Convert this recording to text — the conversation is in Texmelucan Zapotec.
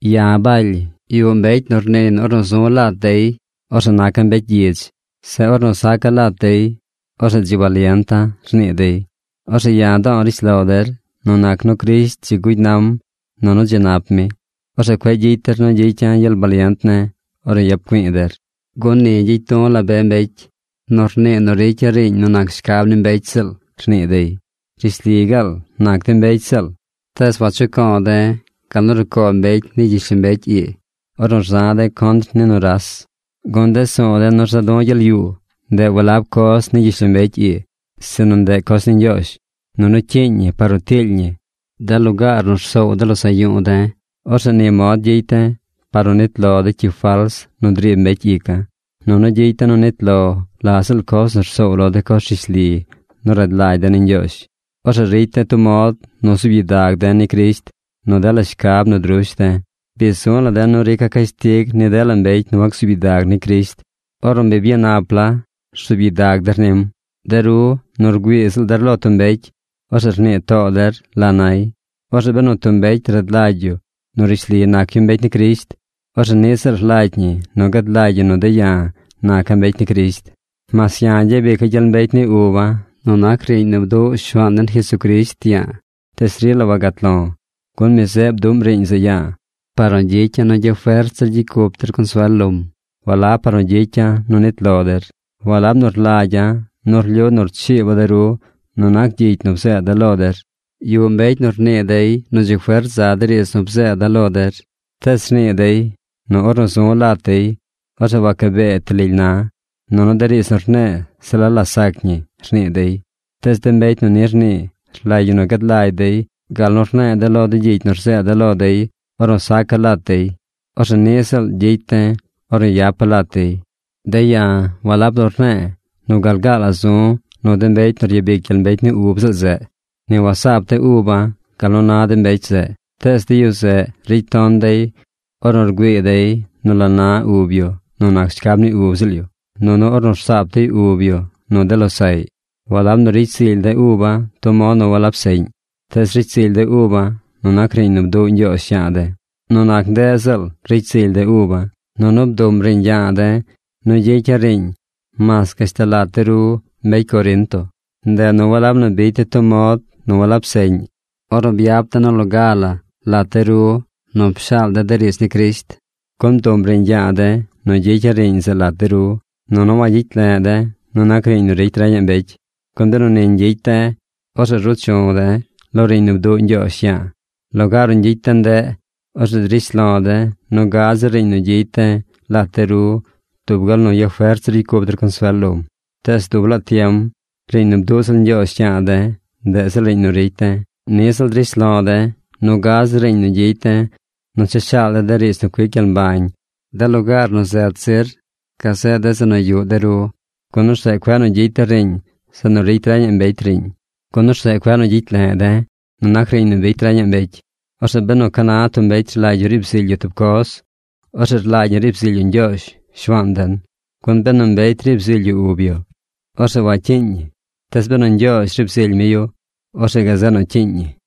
Ya̱ Baly. Yuꞌ mbecy nu rniiy nu ornu zu̱ lat dey, orzeꞌ naca̱ mbecy gyidz. Zeꞌ ornu saca̱ lat dey, orzeꞌ dzi balienta̱, rnii dey. Orzeꞌ ya̱ do̱o̱ rishlo der, nu nac nu Crisht dzi gugy nam nunu dzi nap mi, orzeꞌ cueꞌ gyicy der nu gyicya̱ gyel balient ne̱ ornu yap güi̱i̱ der. Gun ni gyicy du̱ la be mbecy nu rnii nu ricya̱ riiñ nu nac shcab ni mbecy ziꞌl, rnii dey. Rishli gaal nac de̱ mbecy ziꞌl. Tees wachuco̱o̱ de̱ gal nu rucoo mbecy ni gyishlombecy ii ornu rza̱ de̱ contr ni nuras. Gun de su̱u̱ de̱ nu rza du̱ gyel yuu, ndeꞌ walab coz ni gyishlombecy ii, sinu ndeꞌ de coz ni Ñgyoozh. Nunu cyiiñ ñi par nu tiily ñi de lugaar nu rsoow de losaꞌ yu̱u̱ de̱. Orzeꞌ ni mod gyicy de̱ par nu nit lo de cyi fals nu driib mbecy ica̱. Nunu gyicy de̱ nu nit lo la ziꞌl coz nu rsoow lo de coz rishli nu rad lagy de̱ ni Ñgyoozh. Orzeꞌ ricy de̱ tub mod nu zuub gyidag de̱ ni Crisht nu dela shcab nu drush de̱. Bi zu̱ la̱ de̱ nu rica̱ cashtig ni dela mbecy nu wacsuub gyidag ni Crisht ornu bi byanap la rzuub gyidag der nim. De ru nu rgüii ziꞌl der lo tub mbecy, orzeꞌ rnii too der la nay. Orzeꞌ benu tub mbecy rad lagy yu nu rishli nac yu mbecy ni Crisht, orzeꞌ niꞌ ziꞌl rlagy ñi nu gad lagy yu nu de̱ ya̱ naca̱ mbecy ni Crisht. Mas ya̱ gyabica̱ gyel mbecy ni uba̱ nu nac riiñ nu bduꞌ Shuaan den Jesucrisht ya̱a̱, tees rila wagat lo̱. Gun mi zeꞌ bduꞌm riiñ zeꞌ ya̱a̱ par nu gyicya̱ nu gyafert zir gyicy cup der consuel lom, walab par nu gyicya̱ nu nit lo der. Walab nu rlagya̱ nu rlyu nu rchiiba̱ de ru nu nac gyicy nu bzeeda̱ lo der. Yuꞌ mbecy nu rnii dey nu dzi fert za de riidz nu bzeeda̱ lo der. Tees rnii dey nu ornu zu̱ lat dey, orzeꞌ wacabee ti lily na̱. Nunu de riidz nu rne̱e̱ se la la sac ñi, rnii dey. Tees de mbecy nu ni rnii rlagy ñi nu gad lagy dey gal nu rne̱e̱ de̱ lo de gyicy nu rzeeda̱ lo dey ornu saca̱ lat dey, orzeꞌ niꞌ ziꞌl gyicy de̱ ornu yapa̱ lat dey. De̱ ya̱ walab nu rne̱e̱ nu gal gaal la zu̱ nu de mbecy nu ryabic gyel mbecy ni ub ziꞌl zeꞌ. Ni wasaap de̱ uba̱ gal nu na de mbecy zeꞌ. Tees de yu zeꞌ ricy ton dey ornu rgüii dey nu la na ub yu nu nac shcab ni ub ziꞌl yu, nunu ornu rsaap dey ub yu nu de losaꞌy. Walab nu ricy zily de̱ uba̱ tub mod nu walab seꞌñ. Tees ricy zily de̱ uba̱ nu nac riiñ nu bduꞌ Ñgyoozh ya̱a̱ de̱. Nu nac ndeꞌ ziꞌl ricy zily de̱ uba̱. Nunu bduꞌm riiñ ya̱a̱ de̱ nu gyicya̱ riiñ mas gashtal lat de ru mbecy Corinto. Ndeꞌ nu walab nu bicy de̱ tub mod nu walab seꞌñ ornu byap de̱ nu loga la lat de ru nu pshaal de̱ de riidz ni Crisht. Gun bduꞌm riiñ yaa de̱ nu gyicya̱ riiñ zeꞌ lat de ru. Nunu wagyicy le̱ꞌ de̱ nu nac riiñ nu ricy reñaꞌ mbecy, gun benu ni ñgyicy de̱, orzeꞌ ruu chu̱ de̱ lo riiñ nu bduꞌ Ñgyoozh ya̱a̱. Lugaar nu ñgyicy de̱ ndeꞌ, orzeꞌ drish lo̱ de̱ nu gad zir riiñ nu gyicy de̱ lat de ru dub gal nu yafert zir ricy cup der consuel lom. Tees dub laa tiem riiñ nu bduꞌ ziꞌl Ñgyoozh yaa de̱, ndeꞌ ziꞌl riiñ nu ricy de̱. Niꞌ ziꞌl drish lo̱ de̱ nu gad zir riiñ nu gyicy de̱ nu cha shaal de̱ de riidz nu cuic gyel mbañ de lugaar nu zet zir gazeꞌ de zeꞌ nu yuꞌ de ru, gun orzeꞌ cueꞌ nu gyicy de̱ riiñ zeꞌ nu ricy reñaꞌ mbecy riiñ, gun orzeꞌ cueꞌ nu gyicy le̱ꞌ de̱ nu nac riiñ nu bicy reñaꞌ mbecy. Orzeꞌ benu ca na tub mbecy rlagy yu riib zily yu tub coz, orzeꞌ rlagy ñi riib zily yu Ñgyoozh, Shuaan den. Gun benu mbecy riib zily yu ub yu, orzeꞌ wacyiiñ ñi. Tees benu Ñgyoozh riib zily mi yu, orzeꞌ gazeꞌ nu cyiiñ ñi.